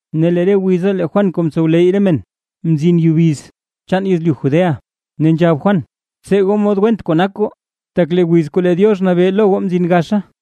Ne lee re wiza lee Juan kuu mtsowleyy re men, mzin yubiz chaan yezlyu Judea. Ne nzhab Juan: ―¡Btsee goo mod went kuu nak goo, tak lee wiz kuu lee Diox nabee lo goo mzin gaxa!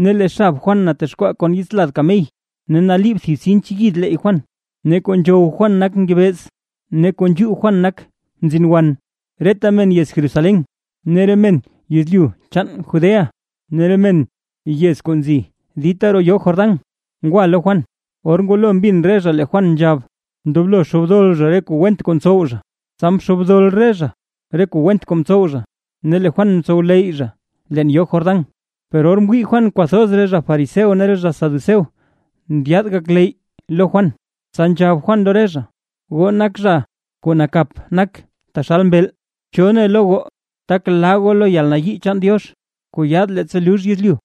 Ne lee xab Juan natexkwaa kon yits lad kamey, ne naliib thib sinch yid leeyy Juan; ne kuu nzhow Juan nak ngebeez ne kuu nzhuu Juan nak mzin wan. Reta men yez Jerusalén, re men yezlyu chaan Judea, ne re men re yez kuu nzi dita roo yoo Jordán ngwa lo Juan. Or ngwalo mbin re zha lee Juan nzhab, ndoblo xoobdol zha re kuu went kuu mtsow zha. Tsa mxoobdol re zha re kuu went kuu mtsow zha, ne lee Juan mtsowleyy zha leen yoo Jordán. Per or mwii Juan kwathoz re zha fariseo ne re zha saduceo ndyaad gakleyy lo Juan, tsa nzhab Juan lo re zha: ―¡Goo nak zha kuu nakap nak taxal mbeel! ¿Cho ne lo goo tak laa goo lo yalnayii chaan Diox, kuu yaad leettsa lux yezlyu?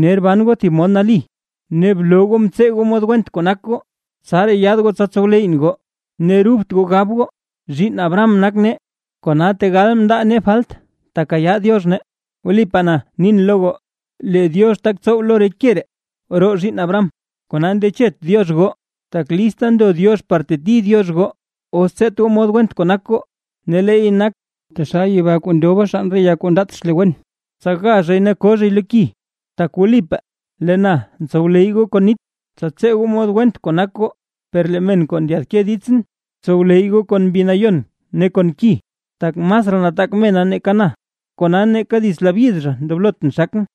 Ner ban goo thib mod nali, ne bloo goo mtsee goo mod went kuu nak goo, tsaraa yaad goo tsa tsow leyyʼn goo, ne rubt goo gab goo: “Zhiinn Abraham nak nee”. Kona tegal ndaa nee falt tekayaa Diox nee, tak wlipaa na nin lo goo, lee Diox tak tsow lo re ke ree roo zhiinn Abraham, kona ndechet Diox goo. Tak lista ndo Diox par teti Diox goo, os tseet goo mod went kuu nak goo, ne leey nak, taxal yeba kuu ndoba xann re ya kuu ndaat xle wen, tsa ga zhay ne ko zhay lo ki. Tak wlipaa lee na ntsowleyy goo kon nit, tsa tsee goo mod went kuu nak goo; per lee men kuu ndyaadke ditsʼn, tsowleyy goo kon Mbi Nayon ne kon ki, tak masraa nataak zha nake na, kona neeka dits labyid zha ndoblotʼn xakʼn.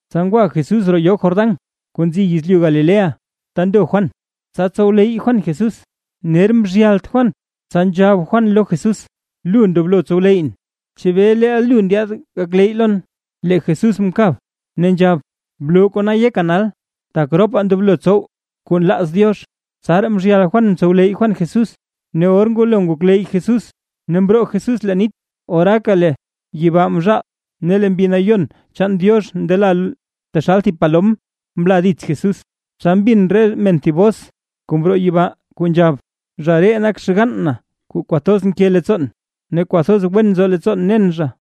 Tsa ngwa Jesús roo yoo Jordán kuu nzi yezlyu Galilea ta ndo Juan, tsa tsowleyy Juan Jesús. Ner mzhyalt Juan, tsa nzhab Juan lo Jesús: ―Lu ndoblo tsowleyyʼn. ¿Chebee leel lu ndyaad gakleyy lon? Lee Jesús mkab, ne nzhab: ―Bloo kona yeka nal, tak ropaa ndoblo tsow kuu nlaaz Diox. Tsaraa mzhyal Juan mtsowleyy Juan Jesús. Ne or ngwalo ngokleyy Jesús ne mroo Jesús leen nit, oraaka lee yibaa mzhaal, ne lee Mbi Nayon chaan Diox ndela taxal thib palom mla dits Jesús. Tsa mbin re men thib bos kuu mroo yibaa kuu nzhab: ―Zha ree nak xgann na kuu kwathoz nke leettsoon, ne kwathoz wen nzo leettsoon nen zha.